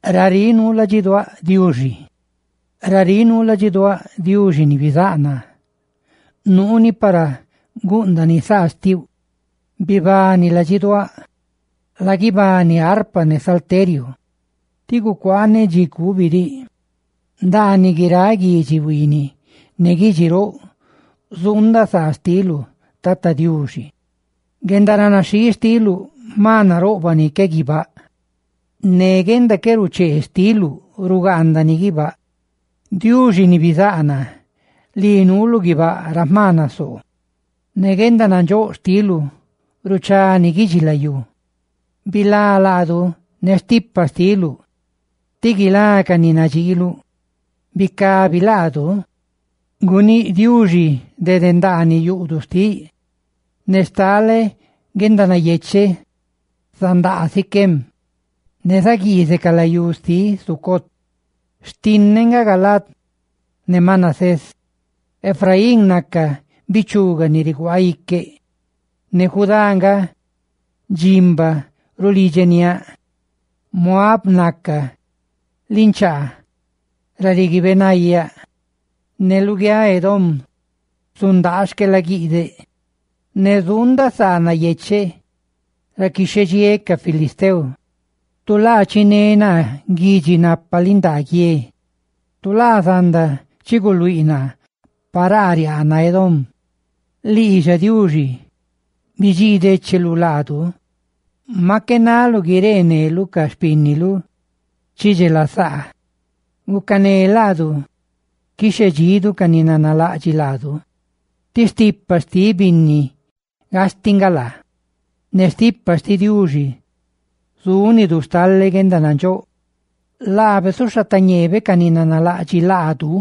Raríꞌ nuu ladxiduáꞌ, Diuxi ni bizáꞌ naa, ¡nuuni para gúꞌndani saa xtiuꞌ! Ladxiduáꞌ, bibani; laguibani arpa ne salteriu; ¡tí gucuaaneꞌ dxi cubi diꞌ! Ndaaniꞌ guiráꞌ guidxi huiiniꞌ ne guidxi roꞌ zuundaꞌ saa xtiluꞌ, Tata Diuxi. Guendaranaxhii xtiluꞌ jma naroꞌbaꞌ ni que guibáꞌ. ¡Ne guenda qué ruchee xtiluꞌ rugaandani guibáꞌ nasiá! ¡Diuxi ni bizáꞌ naa, lii nuulu guibáꞌ ra jma nasoo; guendanandxóꞌ xtiluꞌ ruchá guidxilayú! Bilá laadu ne stipa xtiluꞌ, ti guilá ca ni nadxiiluꞌ. ¡Bicabi laadu! Guníꞌ Diuxi dede ndaaniꞌ yuꞌduꞌ xtiꞌ: «¡Ne stale guendanayecheꞌ zandaa Siquem, ne zaguiizeꞌ ca layú xtiꞌ Sucot! Xtinneꞌ nga Galaad ne Manasés; Efraín naca bichuga ni riguaaꞌ iqueꞌ; ne Judá nga dximba rulidxeniáꞌ; Moab naca ninchaa ra riguiibeꞌ nayaꞌ; ne luguiáꞌ Edom zulaa xquelaguiꞌdeꞌ; ¡ne zuundaꞌ saa nayecheꞌ ra quixhedxiéꞌ ca filisteo!» Tu laa chiné naa guidxi napa lindaa guie. Tu laa zanda chi guluíꞌ naa paraa riaana Edom. Lii xa, Diuxi, bidxii décheluꞌ laadu; ¡maꞌ qué naluꞌ guireeneluꞌ ca xpínnidu ni chidxelasaa! Gucané laadu quixhedxidu ca ni nanalaꞌdxiꞌ laadu, tí stipa xtiꞌ binni gastiꞌ nga laa. Ne stipa xtiꞌ Diuxi zúnidu stale guendanandxóꞌ; ¡laabe zuxhatañeebe ca ni nanalaꞌdxiꞌ laadu!